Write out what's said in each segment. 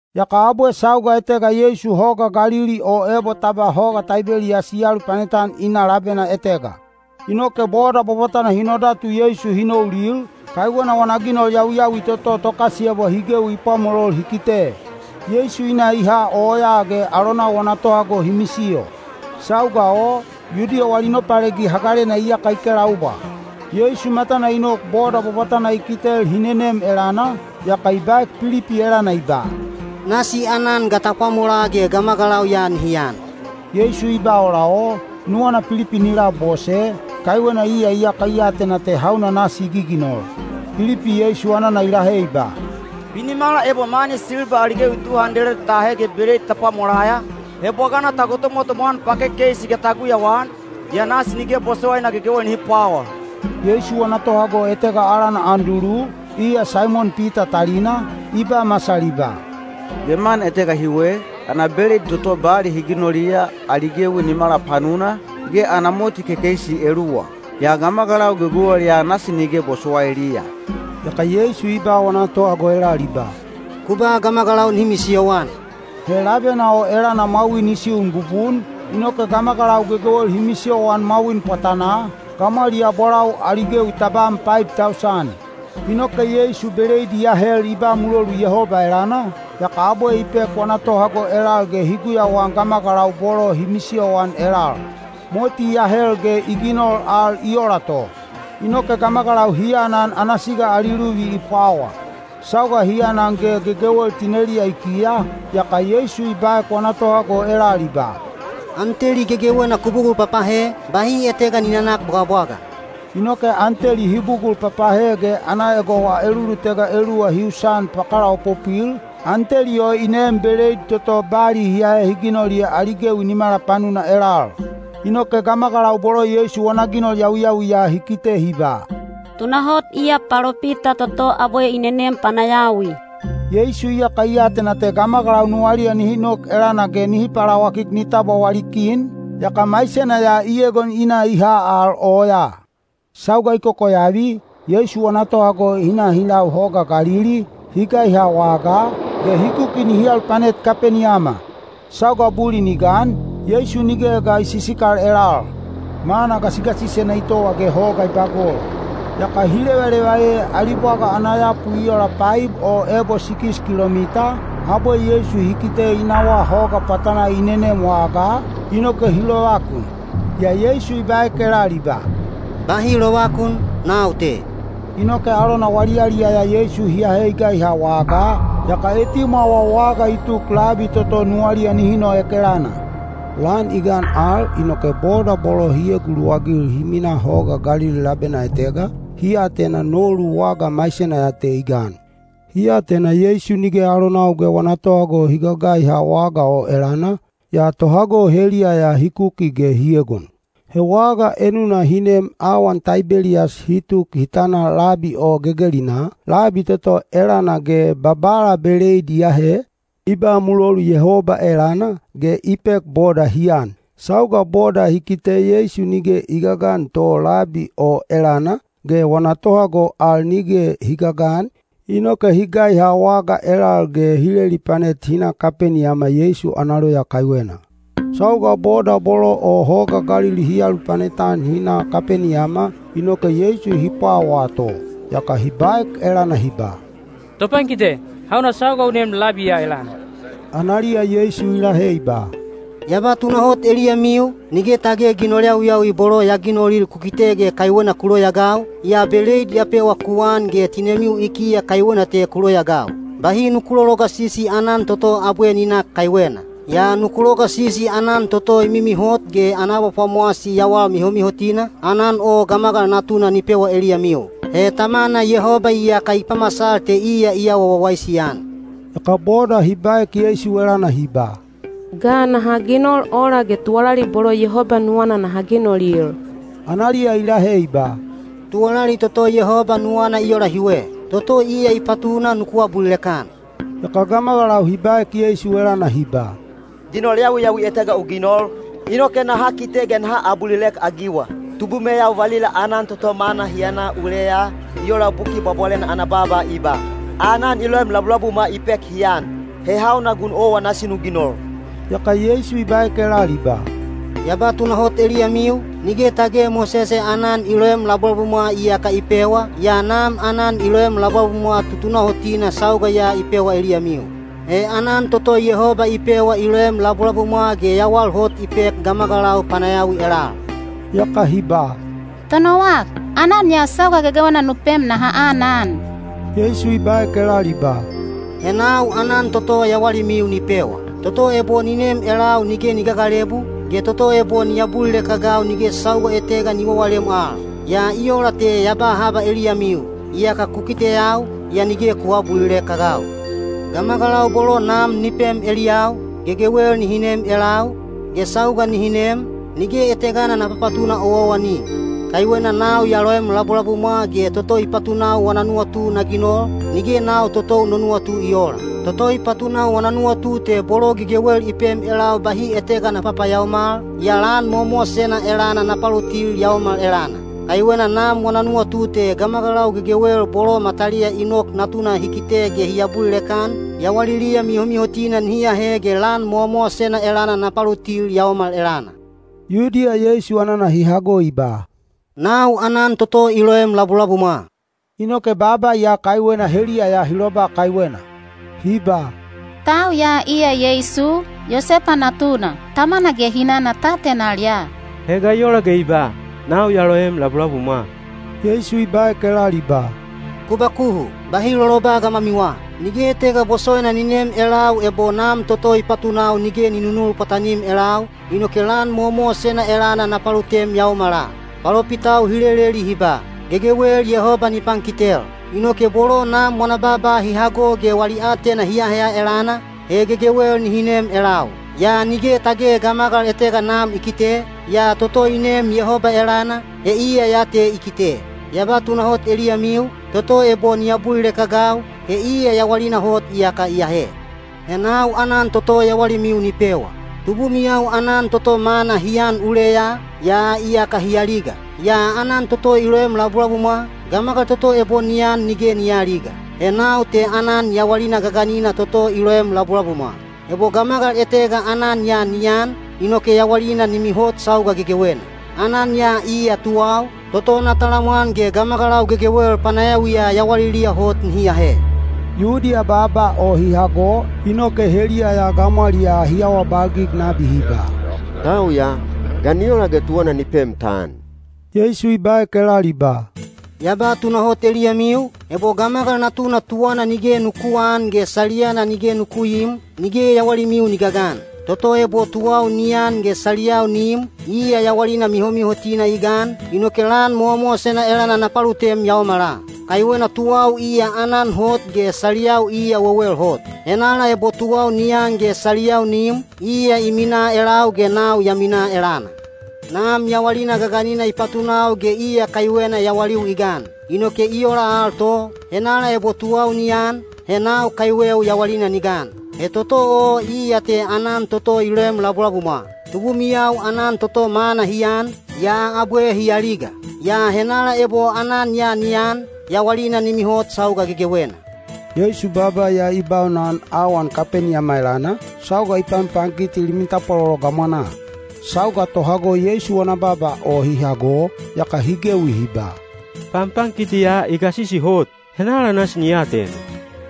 Yaka abwe sauga etega Yeisu Hoga Galili (o ebo ta ba Hoga Taibeliyas) i alupanet-an i na labena etega. Inoke boda bwabwatana hi nodatu Yeisu hi noulil, kaiwena wana ginol yawiyawi toto tokasiyebwa hi gewi i pwamolol hi kite. Yeisu i na i ha oyaa ge alonau wana tohago hi misiyo. Sauga o, Yudiya wali Nopalegi Hagalena iyaka i kelaubwa. Yeisu matana i nok boda bwabwatana i kitel hi nenem elana, yaka i baek Pilipi elana i ba, “Nasi aanan ga ta pwamolaa ge gamagalau ya nihi an?” Yeisu i ba ola o, nuwana Pilipi ni labose, kaiwena iya iyaka i atena te hauna nasi i giginol. Pilipi Yeisu anana i lahe i ba, “Binimala ebo mani silba ali gewi tu handeled ta ahe ge beleid ta pwamolaya, he bwagana ta gotomwatomwa-an pakekeisi ge ta guyauan, yaa nasi nige bosowaina gegewel nihi pwawa.” Yeisu wana tohago etega alana Andulu, iya Saimon Pita talina, i ba masal i ba, “Geman etega hiwe, ana beleid toto bali hi ginoliya, ali gewi nimala panuna, ge ana moti kekeisi eluwa. Yaa gamagalau gegewel ya nasi nige bosowailiya!” Yaka Yeisu i ba wana tohago elal i ba, “Ku ba gamagalau nihi misiyoan.” He labena o elana mwawin i siun bubun, inoke gamagalau gegewel hi misiyoan mwawin pwatanaa, gamwaliyaa bolau ali gewi tabam paib tausan. Inoke Yeisu beleid i ahel i ba mulolu Yehoba elana, yaka abwe i pek wana tohago elal ge hi guyauan gamagalau bolo hi misiyoan elal. Moti i ahel ge i ginol al i ola to. Inoke gamagalau hi anan ana siga ali luvi i pwawa. Sauga hi anan ge gegewel tineliya i kiya, yaka Yeisu i baek wana tohago elal i ba, “An teli gegewena ku bugul papahe, bahi etega ni nanak bwagabwaga.” Inoke an teli hi bugul papahe ge ana egowa elulutega eluwa hi usan pakalaopopwil, an teli o i neem beleid toto bali hi ahe hi ginoliya ali gewi nimala panuna elal. Inoke gamagalau bolo Yeisu wana ginol yawiyawi ya hi kite hi ba, “Tunahot iya palopita toto abwe i nenem panayawi.” Yeisu iyaka i atena te gamagalau nuwaliya nihi nok elana ge nihi palawakik ni tabwa wali kin, yaka maisena ya i egon i na i ha al oyaa. Sauga i kokoyavi, Yeisu wana tohago hi na hi lau hoga Galili, hi gaiha wagaa, ge hi kuki nihi alupanet Kapeniyama. Sauga bulin i gan, Yeisu nige ga i sisikal elal. Mana gasigasisena i towa ge hoga i bagol. Yaka hi levaleva ee ali bwaga ana yapu i ola paib o ebo sikis kilomita, abwe Yeisu hi kite i nawaa hoga pwatanaa i nenem wagaa, inoke hi lovakun. Yaa Yeisu i baek elal i ba, “Bahi lovakun, nau te.” Inoke alona wali yaliyaya Yeisu hi ahe i gaiha wagaa, yaka etimwawa waga i tuk labi toto nuwaliya nihi noek elana. Lan i gan al, inoke boda bolo hi eguluwagil hi minaa Hoga Galili labena etega, hi atena nolu waga maisena ya te i gan. Hi atena Yeisu nige alonau ge wana tohago hi gagaiha waga o elana, yaa tohago heliya ya hi kuki ge hi egon. He waga enuna hi neem awan Taibeliyas hi tuk hi tana labi o gegelinaa, labi toto elana ge Babala beleid i ahe, i ba mulolu Yehoba elana, ge i pek boda hi an. Sauga boda hi kite Yeisu nige i gagan to labi o elana, ge wana tohago al nige hi gagan, inoke hi gaiha waga elal ge hi lelipanet hi na Kapeniyama Yeisu ana loya kaiwena. Sauga boda bolo o Hoga Galili hi alupanet-an hi na Kapeniyama, inoke Yeisu hi pwawaa to. Yaka hi baek elana hi ba, “Topankite, hauna sauga u nem labi ya elana?” Analiya Yeisu i lahe i ba, “Ya ba tunahot eliyamiu, nige tage ginol yawiyawi bolo ya ginolil ku kite ge kaiwena ku loyaagau, yaa beleid ya pewa ku an ge tinemiu i kiya kaiwena te ku loyaagau. Bahi nuku lologasisi aanan toto abwe ni nak kaiwena. Yaa nuku logasisi aanan toto i mimihot ge ana abapwamowasi yawal mihomihotina, aanan o Gamagal Natuna ni pewa eliyamiu. He Tamana Yehoba iyaka i pamasal te iya i awa wawaisi-an.” Yaka boda hi baek Yeisu elana hi ba, “Ga naha ginol ola ge tuwalali bolo Yehoba nuwana naha ginolil?” Analiya i lahe i ba, “Tuwalali toto Yehoba nuwana i ola hiwe: toto iya i patuna nuku abulilek-an.” Yaka gamagalau hi baek elana hi ba, “Ginol yawiyawi etega u ginol, inoke naha kite ge naha abulilek-agiwa. Tubumeyau valila aanan toto manna hi an uleya, i ola Buki Bwabwalena ana baaba i ba: ‘Aanan i loem labulabumwa i pek hi an.’ He hauna gun owa nasi nu ginol?” Yaka Yeisu i baek elal i ba, “Ya ba tunahot eliyamiu, nige tage Mosese aanan i loem labulabumwa iyaka i pewa, yaa Nam aanan i loem labulabumwa tutunahotina sauga ya i pewa eliyamiu. He aanan toto Yehoba i pewa i loem labulabumwa ge yawal hot i pek gamagalau panayawi elal.” Yaka hi ba, “Tonowak, aanan ya sauga gegewena nu pem naha anan.” Yeisu i baek elal i ba, “He nau aanan toto yawalimiu ni pewa. Toto ebo ni nem elau nige ni gagalebu, ge toto ebo ni abulilek-agau nige sauga etega ni wawalem al. Yaa i ola te ya ba haba eliyamiu: iyaka ku kiteyau, yaa nige ku aabulilek-agau. Gamagalau bolo Nam ni pem eliyau, gegewel nihi nem elau, ge sauga nihi nem, nige etegana na papatuna owaowani. Kaiwena nau ya loem labulabumwa ge toto i patunau wana nuwatu na ginol, nige nau totou no nuwatu i oola. Toto i patunau wana nuwatu te bolo gegewel i pem elau bahi etega na papayaomal, yaa lan mowamowasena elana na palutil yaomal elana. Kaiwena Nam wana nuwatu te gamagalau gegewel bolo mataliya i nok Natuna hi kite ge hi abulilek-an, yawaliliya mihomihotina nihi ahe ge lan mowamowasena elana na palutil yaomal elana.” Yudiya Yeisu anana hi hago i ba, “Nau aanan toto i loem labulabumwa,” inoke baaba ya kaiwena heliya ya hi loba kaiwena. Hi ba, “Tau ya iya Yeisu, Yosepa natuna. Tamana ge hinana ta atenal ya. He ga i ola ge i ba, ‘Nau ya loem labulabumwa’?” Yeisu i baek elal i ba, “Ku bakuhu, bahi loloba gamwamiwa. Nige etega bosowaina ni nem elau ebo Nam toto i patunau nige ni nunul pwatanim elau, inoke lan mowamowasena elana na palutem yaomala. Palopitau hi leleli hi ba, ‘Gegewel Yehoba ni pankitel.’ Inoke bolo Nam wana baaba hi hago ge wali aatena hi aheya elana, he gegewel nihi nem elau. Yaa nige tage gamagal etega Nam i kite, yaa toto i neem Yehoba elana, he iya ya te i kite. Ya ba tunahot eliyamiu, toto ebo ni abulilek-agau, he iya yawalina hot iyaka i ahe. He nau aanan toto yawalimiu ni pewa. Tubumiyau aanan toto manna hi an uleya, yaa iyaka hi aliga. Yaa aanan toto i loem labulabumwa, gamagal toto ebo ni an nige ni aaliga. He nau te aanan yawalina gaganina toto i loem labulabumwa. Ebo gamagal etega aanan ya ni an, inoke yawalina ni mihot sauga gegewena. Aanan ya iya tuwau, toto na talamwan ge gamagalau gegewel panayawiya yawaliliya hot nihi ahe.” Yudiya baaba o hi hago, inoke heliya ya gamwaliyaa hi awabalgig nabi hi ba, “Tau ya, ga ni ola ge tuwana ni pem ta an?” Yeisu i baek elal i ba, “Ya ba tunahot eliyamiu, ebo Gamagal Natuna tuwana nige nuku aan ge saliyana nige nuku iim, nige yawalimiu ni gagan. Toto ebo tuwau ni an ge saliyau ni im, iya yawalina mihomihotina i gan, inoke lan mowamowasena elana na palutem yaomala. Kaiwena tuwau iya aanan hot ge saliyau iya wewel hot. Henala ebo tuwau ni an ge saliyau ni im, iya i minaa elau ge nau ya minaa elana. Nam yawalina gaganina i patunau ge iya kaiwena yawaliu i gan. Inoke i ola al to, henala ebo tuwau ni an, he nau kaiweu yawalina ni gan. He toto o iya te aanan toto i loem labulabumwa. Tubumiyau aanan toto manna hi an, yaa abwe hi aliga. Yaa henala ebo aanan ya ni an, yawalina ni mihot sauga gegewena.” Yeisu baaba ya i baunana awan Kapeniyama elana, sauga i panpankiti limi tapwalolo gamwanaa. Sauga tohago Yeisu wana baaba o hi hago, yaka hi gewi hi ba, “Panpankiti ya i gasisi hot. Henala nasi ni atena?”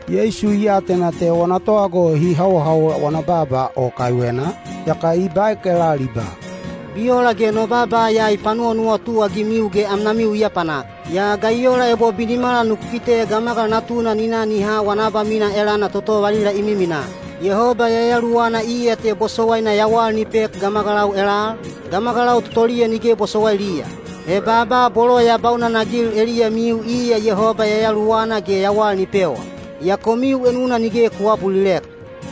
Yeisu i atena te wana tohago hi hawohawol wana baaba o kaiwena, yaka i baek elal i ba, “Bi ola ge no baaba ya i panuwanuwatu-agimiu ge amnamiu i apanak? Yaa ga i ola ebo binimala nuku kite Gamagal Natuna ni na ni ha wana abamina elana toto valila i miminaa? Yehoba Yayaluwana iya te bosowaina yawal ni pek gamagalau elal, gamagalau totoliya nige bosowailiya. He baaba bolo ya baunanagil eliyamiu iya Yehoba Yayaluwana ge yawal ni pewa. Yaa komiu enuna nige ku aabulilek.”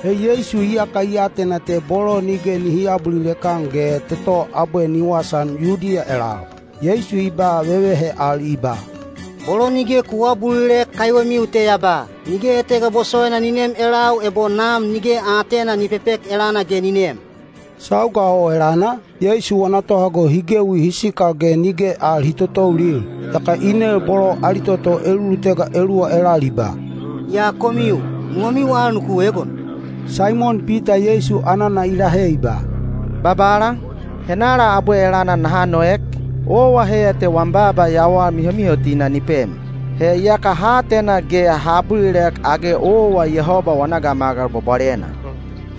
(He Yeisu iyaka i atena te bolo nige nihi aabulilek-an ge toto abwe ni wasaan Yudiya elal.) Yeisu i ba vevehe al i ba, “Bolo nige ku aabulilek kaiwemiu te ya ba, ‘Nige etega bosowaina ni nem elau ebo Nam nige aatena ni pepek elana ge ni nem.’” Sauga o elana, Yeisu wana tohago hi gewi hi sikal ge nige al hi totoulil. Yaka i nel bolo ali toto elulutega eluwa elal i ba, “Yaa komiu, nuwamiu al nuku egon?” Saimon Pita Yeisu anana i lahe i ba, “Babala, henala abwe elana naha noek? Owa heiya te wam baaba yawal mihomihotina ni pem. He iyaka ha atena ge ha abulilek age owa Yehoba wana Gamagal Bwabwalena.”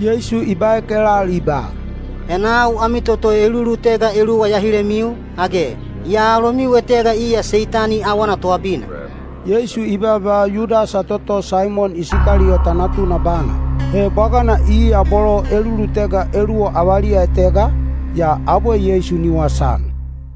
Yeisu i baek elal i ba, “He nau ami toto elulutega eluwa ya hilemiu, age? Yaa alomiu etega iya Seitani awana toabina.” Yeisu i baaba Yudasa toto Saimon Isikaliyota natuna bana. He bwagana iya bolo elulutega eluwa avaliya etega, yaa abwe Yeisu ni wasaan.